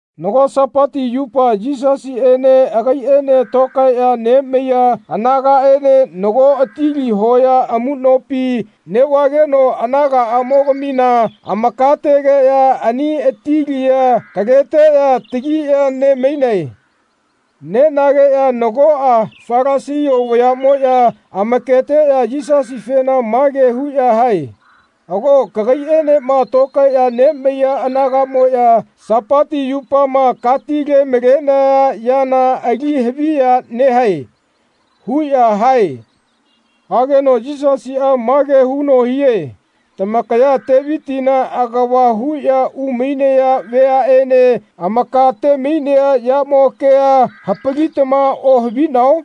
Nago Sapati yupa Yisasiꞌene agaiꞌaene tokaeꞌya nemaiya anagaꞌaene nago atili hoya amuꞌnopi neꞌvageno anagaꞌamogamina amakategeꞌya ani atilia kaleteꞌya takiꞌya ne-mainae. Nenageꞌya nagoꞌa Falasia vayaꞌmoꞌya amaketeꞌya Yisasifena mage huꞌya hae “Ago kagaiꞌenema tokaeꞌya nemaiya anagaꞌmoꞌya Sapati yupama katile-malenaya yana ali haviya nehae.” huꞌya hae. Hageno Yisasiꞌa mage huno hie “Tamakaya Tevitina agava huꞌya umainaya vayaꞌene amaka-te-mainea yamo kea hapalitama ohavinao?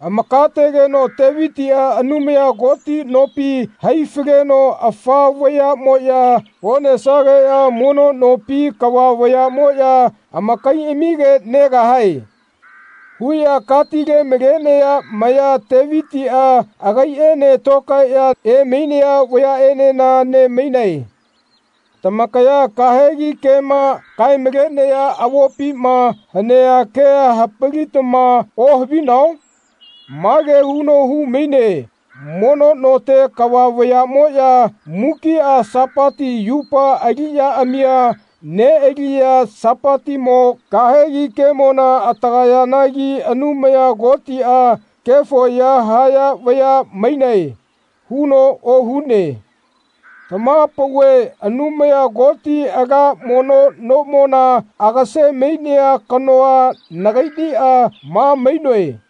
Amakategeno Tevitiꞌa Anumaya Koti nopi hai-faleno ‘Afa vayaꞌmoꞌya onesageꞌya mono nopi kava vayaꞌmoꞌya amakaiꞌamige negahae.’ huꞌya katile-malenaya maya Tevitiꞌa agaiꞌaene tokaeꞌya emainaya vayaꞌenena ne-mainae. Tamakaya kahegi kema kae-malenaya avopima hanea kea hapalitama ohavinao? Mage huno hu-maine mono note kava vayaꞌmoꞌya mukiꞌa Sapati yupa aliꞌyaꞌamia neꞌaliꞌya Sapatimo kahegi kemona atagayayanagi Anumaya Kotiꞌa ‘Kefo ya haya vaya mainae.’ huno ohune. Tamaha-pauve Anumaya Koti ala mono nomona agase-mainea kanoa nagaiꞌniꞌa ma mainoe.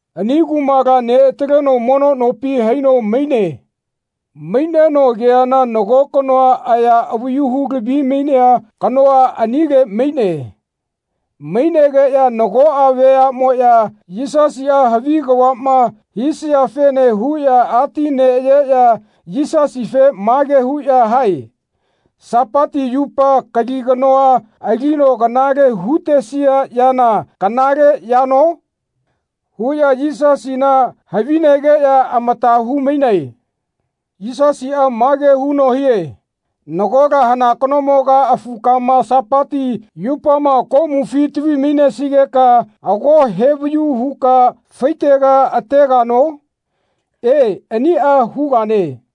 Ani kumala neꞌataleno mono nopi haino maine. Maineno ageana nago kanoa aya avayu hu-lavi-mainea kanoa anile maine. Mainegeꞌya nagoꞌa vayaꞌmoꞌya Yisasiꞌa havi kavaꞌma hisiafene huꞌya ati neꞌayeꞌya Yisasife mage huꞌya hae “Sapati yupa kali kanoa alino kanale hu-tesia yana kanale yano?” huꞌya Yisasina havinegeꞌya amata hu-mainae. Yisasiꞌa mage huno hie “Nagola hana kanomoga afukama Sapati yupama komufi tavi-mainesigeka ago hevayu huka faitega ategano? E aniꞌa hugane.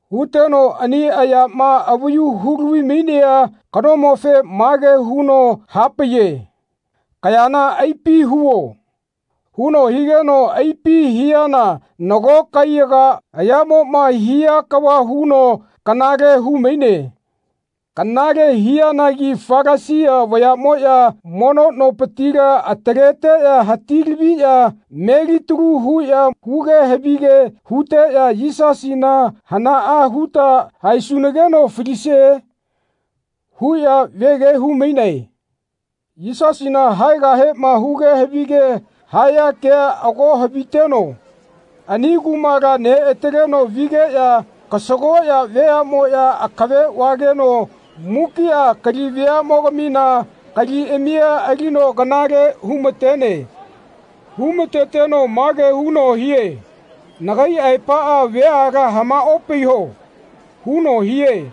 Huteno ani ayama avayu hulavi-mainea kanomofe mage huno hapaiye “Kayana aipi huo.” huno higeno aipi hiana nago kaiyaga ayaꞌmoꞌma hia kava huno kanale hu-maine. Kanale hianagi Falasia vayaꞌmoꞌya mono nopitila ataleteꞌya hati-laviꞌya melitalu huꞌya huge havige huteꞌya “Yisasina hanaꞌa huta haesunageno falisie?” huꞌya vege hu-mainae. Yisasina haegahema huge havige haya kea ago haviteno ani kumala neꞌataleno vigeꞌya kasagoꞌya veaꞌmoꞌya akave vageno mukiꞌa kali veaꞌmogamina kaliꞌamia alino kanale hu-ma-tene. Hu-ma-teteno mage huno hie “Nagai aepaꞌa veala hamaꞌopaiho.” huno hie.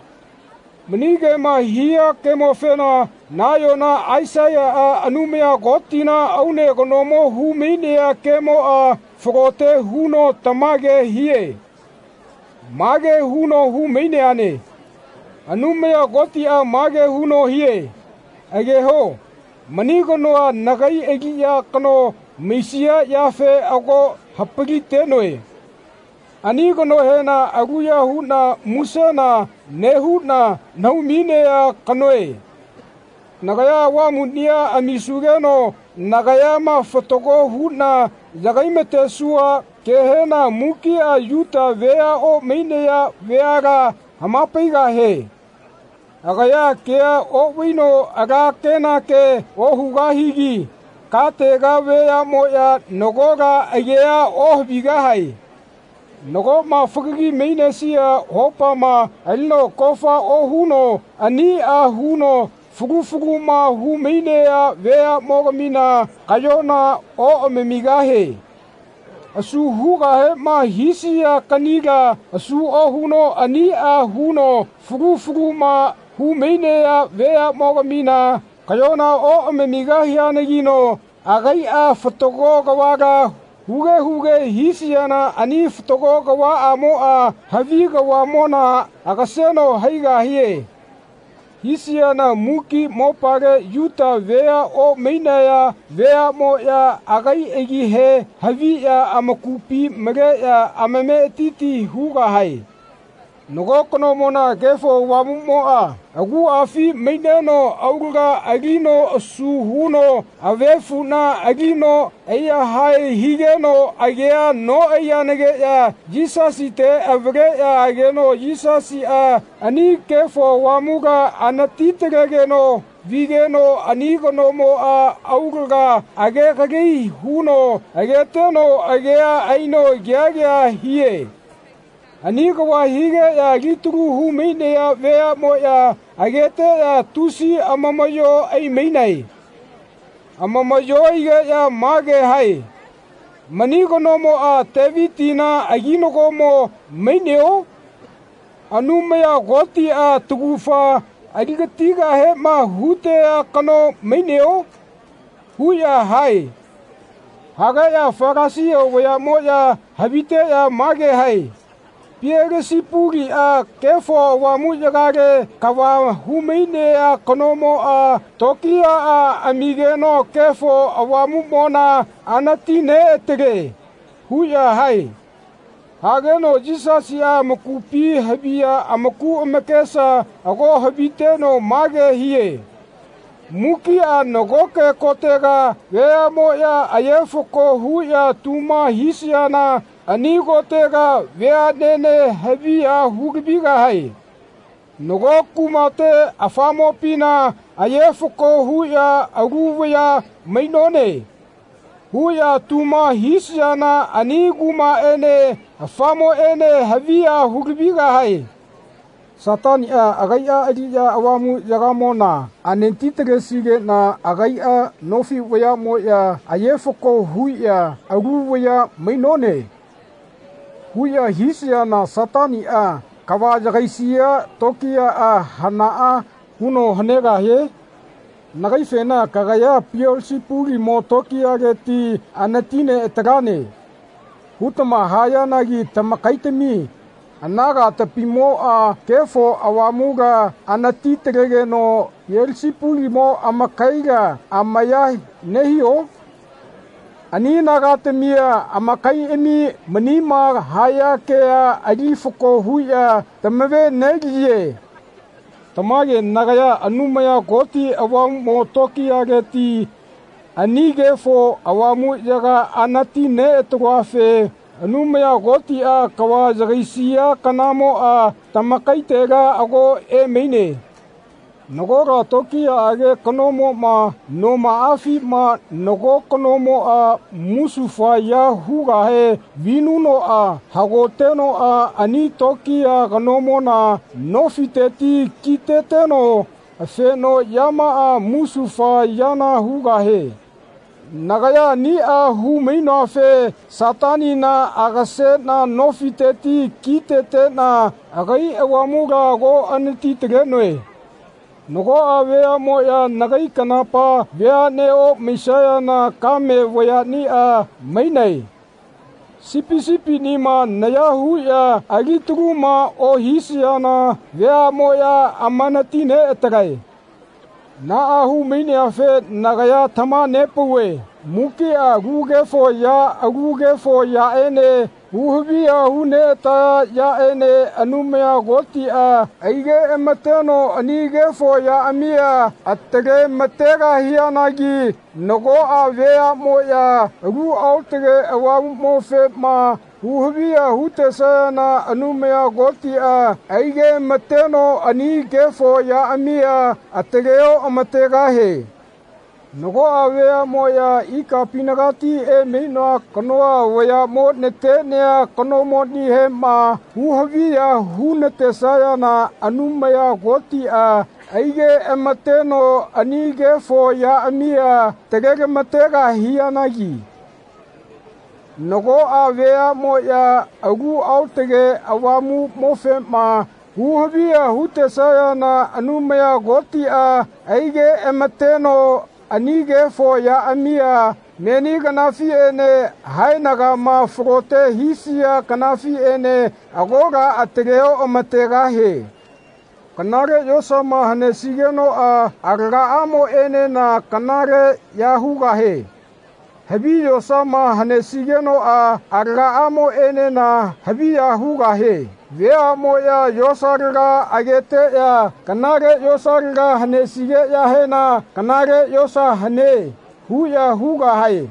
Mani kema hia kemofena nayona Aisaiyaꞌa Anumaya Kotina aune kanomo hu-mainea kemoꞌa falote huno tamage hie. Mage huno hu-maineane. Anumaya Kotiꞌa mage huno hie ageho mani kanoa nagai aliꞌya kano maisia yafe ago hapali-tenoe. Ani kanohena aluya huꞌna musena nehuꞌna nahau-mainea kanoe. Nagaya Avamuꞌnia amisugeno nagayama fatago huꞌna yagai-matesua kehena mukiꞌa Yuta vea omainaya veala hama-paigahie. Agaya kea oꞌvaino ala kenake ohugahigi katega veaꞌmoꞌya nagola agea ohavigahae. Nagoꞌma fagagi mainesia hopama alino kofa ohuno aniꞌa huno fulu fuluma hu-mainaya veaꞌmoꞌmogamina kaꞌyona oꞌamamigahie. Asu hugahema hisia kaꞌnila asu ohuno aniꞌa huno fulu fuluma hu-mainaya veaꞌmoꞌmogamina kaꞌyona oꞌamamigahianagino agaiꞌa fatago kavala huge huge hisiana ani fatago kavaꞌamoꞌa havi kavaꞌmona agaseno haigahie. Haisiana muki mopale Yuta vea omainaya veaꞌmoꞌya agai agihe haviꞌya amakupi maleꞌya amametiti hugahae. Nago kanomona Kefo Avamuꞌmoꞌa aguꞌafi maineno aulaga alino asu huno avefuꞌna alino ai-yahae higeno agea noꞌaiyanagiꞌya Yisasite avaleꞌya ageno Yisasiꞌa ani Kefo Avamula anati-talegeno vigeno ani kanomoꞌa aulaga age-gali huno ageteno agea aino kea kea hie. Ani kava higeꞌya alitalu hu-mainaya veaꞌmoꞌya ageteꞌya tusi amamaꞌyo ai-mainae. Amamaꞌyo aigeꞌya mage hae “Mani kanomoꞌa Tevitina aginagomo maineo? Anumaya Kotiꞌa taugafa ali-gatigahema hutea kano maineo?” huꞌya hae. Hageꞌya Falasia vayaꞌmoꞌya haviteꞌya mage hae “Pielesepuliꞌa Kefo Avamuꞌyagale kava hu-mainea kanomoꞌa tokiyaꞌa amigeno Kefo Avamuꞌmona anati-neꞌatale.” huꞌya hae. Hageno Yisasiꞌa amakupi haviya amaku amakesa ago haviteno mage hie “Mukiꞌa nagoke kotega veaꞌmoꞌya aye-fako huꞌya tuma hisayana ani kotega veaꞌnene haviya hu-lavigahae. Nago kumate afamopina aye-fako huꞌya ‘Alu vaya mainone.’ huꞌya tuma hisayana ani kumaꞌene afamoꞌene haviya hu-lavigahae. Sataniꞌa agaiꞌa aliꞌya Avamuꞌyagamona anati-talesiana agaiꞌa nofi vayaꞌma aye-fako huꞌya ‘Alu vaya mainone.’ huꞌya hisayana Sataniꞌa kava yagaisia tokiyaꞌa hanaꞌa huno hanegahie? Nagaifena ‘Kagaya Pielesepulimo tokiyaleti anati-neꞌatalane.’ hutama hayanagi tamakaitami anagatamimoꞌa Kefo Avamula anati-talageno Pielesepulimo amakaila amaya nehio? Ani anagatamia amakaiꞌami manima haya kea ali fako huꞌya tamave-neliye. Tamage nagaya Anumaya Koti Avamuꞌmo tokiyaleti ani Kefo Avamuꞌyaga anati-neꞌataloafe Anumaya Kotiꞌa kava yagaisia kanamoꞌa tamakaitela ago emaine. Nagola tokiyaꞌage kanomoꞌma nomaꞌafima nago kanomoꞌa musufa ya hugahe vinunoꞌa hagoteno ani tokiya kanomona nofiteti ki-teteno afenoꞌyamaꞌa musufa yana hugahie. Nagaya aniꞌa hu-mainoafe Satanina agaseꞌna nofiteti ki-teteꞌna agai Avamula ago anati-talenoe. Nagoꞌa veaꞌmoꞌya nagai kanapa veaꞌne omaisayana kame vayaꞌniꞌa mainae. Sipi sipiꞌnima naya huꞌya ali-taluma ohisaya veaꞌmoꞌya amanati-neꞌatalae.” Naꞌa hu-maineafe nagaya tamaha-nepauve mukiꞌa alu kefo ya alu kefo yaꞌene hu-haviya hu-neꞌataya yaꞌene Anumaya Kotiꞌa aigeꞌama-teno ani kefo yaꞌamia atale-ma-tegahianagi nagoꞌa veaꞌnemoꞌya Alu aotage Avamuꞌmofema hu-haviya hu-tesayana Anumaya Kotiꞌa aigeꞌma-teno ani kefo yaꞌamia atale-oꞌama-tegahie. Nagoꞌa veaꞌmoꞌya ikapinagati emainoa kanoa vayaꞌmo natenea kanomonihema hu-haviya hu-natesayana Anumaya Kotiꞌa aigeꞌama-teno ani kefo yaꞌamia atale-ma-tegahianagi nagoꞌa veaꞌmoꞌya Alu Aotage Avamuꞌmofema hu-haviya hu-tesayana Anumaya Kotiꞌa aigeꞌamateno ani kefo yaꞌamia meni kanafiꞌene haenagama falote hisia kanafiꞌene agola atale-oꞌama-tegahie. “Kanale yosama hanesigenoꞌa alagaꞌamoꞌenena kanaleꞌya hugahie. Havi yosama hanesigenoꞌa alagaꞌamoꞌenena haviya hugahie. Veaꞌmoꞌya yosalaga ageteꞌya kanale yosalaga hanesigeꞌyahena ‘Kanale yosa hane.’ huꞌya hugahae.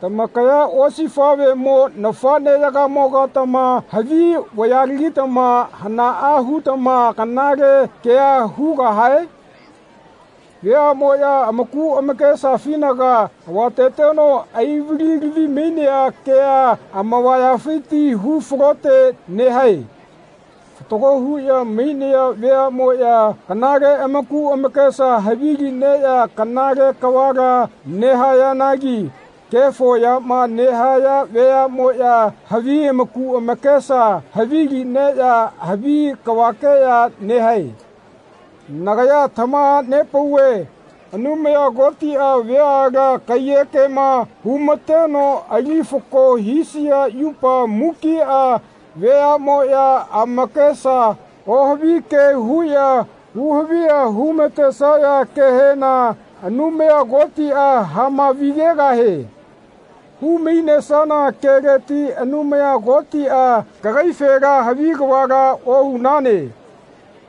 Tamakaya osifaꞌvemo nafaꞌneyagamogatama havi vayalagitama hanaꞌa hutama kanale kea hugahae? Veaꞌmoꞌya amaku amakesafinaga havateteno ai-vali-lavi-mainea kea amavayafiti hu-falote nehae. Fatago huꞌya mainaya veaꞌmoꞌya kanale amaku amakesa havilineꞌya kanale kavala nehayanagi kefo yama nehaya veaꞌmoꞌya havi amaku amakesa havi-lineꞌya havi kavakeꞌya nehae. Nagaya tamaha-nepauve Anumaya Kotiꞌa veala kaiyekema hu-ma-teno ali fako hisia yupa mukiꞌa veaꞌmoꞌya amakesa ohavi ke huꞌya hu-haviya hu-ma-tenesaya kehena Anumaya Kotiꞌa hama-vi-gegahie. Hu-mainesana keleti Anumaya Kotiꞌa kagaifena ‘Havi kavala ohunane.’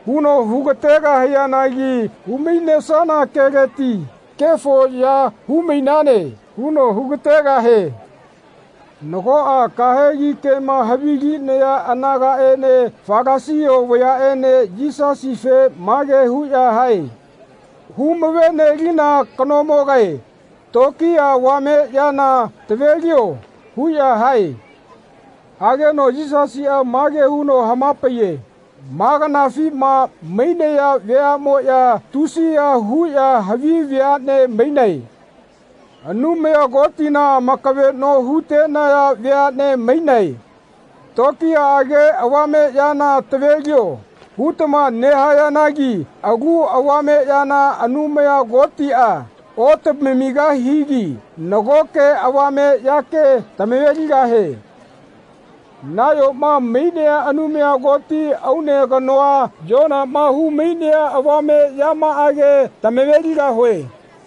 huno hu-ga-tegahianagi hu-mainesana keleti ‘Kefo ya hu-mainane.’ huno hu-ga-tegahie.” Nagoꞌa kahegi kema havilinaya anagaꞌene Falasia vayaꞌene Yisasife mage huꞌya hae “Huma-ve-nelina kanomogae tokiya avame yana tavelio.” huꞌya hae. Hageno Yisasiꞌa mage huno hama-paiye “Ma kanafima mainaya veaꞌmoꞌya tusiya huꞌya havi veaꞌne mainae. Anumaya Kotina amakaveꞌno hu-tenaya veaꞌne mainae. ‘Tokiyaꞌage avame yana tavelio.’ hutama nehayanagi alu avame yana Anumaya Kotiꞌa otamamigahigi nagoke avame yake tama-ve-ligahie. Nayoma mainea Anumaya Koti aune kanoa Yonaꞌma hu-mainea avame yamaꞌage tama-ve-ligahue.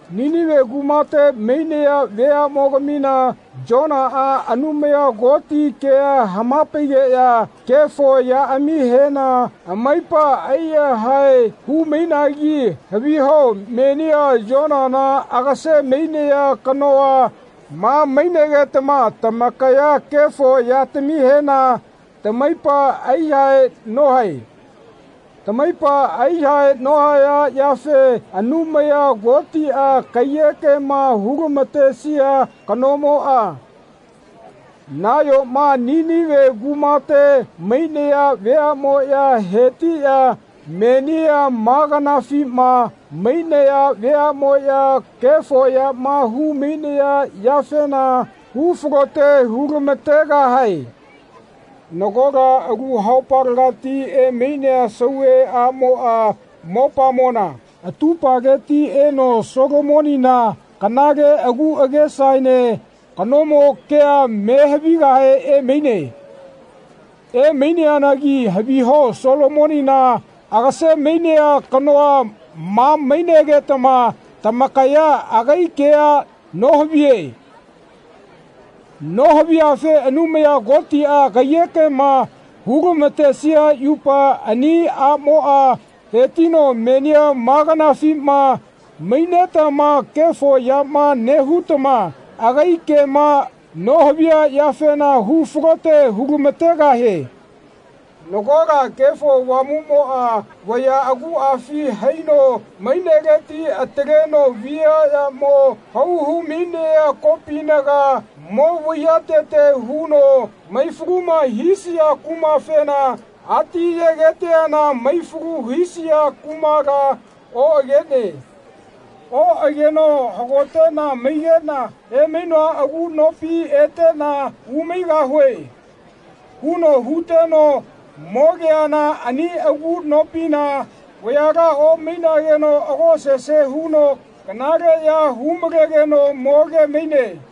Ninive kumate mainaya veaꞌmogamina Yonaꞌa Anumaya Koti kea hama-paigeꞌya kefo yaꞌamihena amaipa aiyahae hu-mainagi haviho menia Yonana agase-mainea kanoa ma mainegetama tamakaya kefo yatamihena tamaipa ai-yahae nohae. Tamaipa ai-yahae nohayafe Anumaya Kotiꞌa kaiyekema hu-lama-tesia kanamoꞌa nayoma Ninive kumate mainaya veaꞌmoꞌya hetiꞌya menia ma kanafima mainaya veaꞌmoꞌya kefo yama hu-mainaya yafena hu-falote hu-lama-tegahae. Nagola alu haupalegati emainea sauve aꞌmoꞌa mopamona atupaleti eno Solomonina kanale agu agesaene kanomo kea me havigahe emaine. Emaineanagi haviho Solomonina agase-mainea kanoa ma mainegetama tamakaya agai kea nohaviye. Nohaviyafe Anumaya Kotiꞌa kaiyekema hu-lama-tesia yupa ani aꞌmoꞌa hetino menia ma kanafima mainetama kefo yama nehutama agai kema nohaviya yafena hu-falote hu-lama-tegahie.” Nagola Kefo Avamuꞌmoꞌa vaya aguꞌafi haino maineleti ataleno viaꞌyamo hau hu-mainea kopinaga mo vaiyatete huno mai-faluma hisia kumafena ati yegeteana mai-falu hisia kumala oꞌagene. Oꞌageno “Hagoteꞌna maigeꞌna emainoa agu nopi eteꞌna umaigahue.” huno huteno mogeana ani agu nopina vayala omaigeno ago sese huno kanale ya hu-malenegeno moge-maine.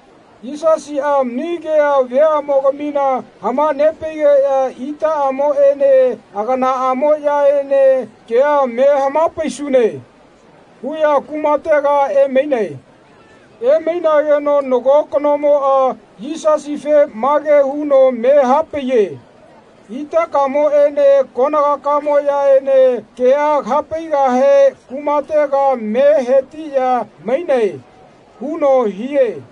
Yisasiꞌa mani kea veaꞌmogamina hama-nepaigeꞌya itaꞌamoꞌene aganaꞌamoꞌyaene “Kea me hapaisune.” huꞌya kumatega emainae. Emainageno nago kanomoꞌa Yisasife mage huno me hapaiye “Itakamoꞌene kaganakamoꞌyaene kea kaha-paigahe kumate me hetiꞌya mainae.” huno hie.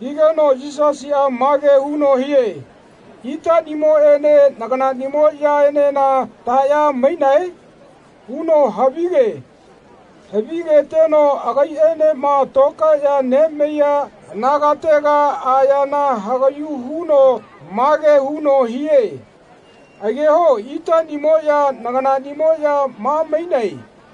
Higeno Yisasiꞌa mage huno hie “Itaꞌnimoꞌene naganaꞌnimoꞌyaenena taꞌya mainae?” huno havi-ge. Havigeteno agaiꞌaenema tokaeꞌya nemaiya anagatega ayana hagaꞌyu huno mage huno hie “Ageho itaꞌnimoꞌya naganaꞌnimoꞌya ma mainae.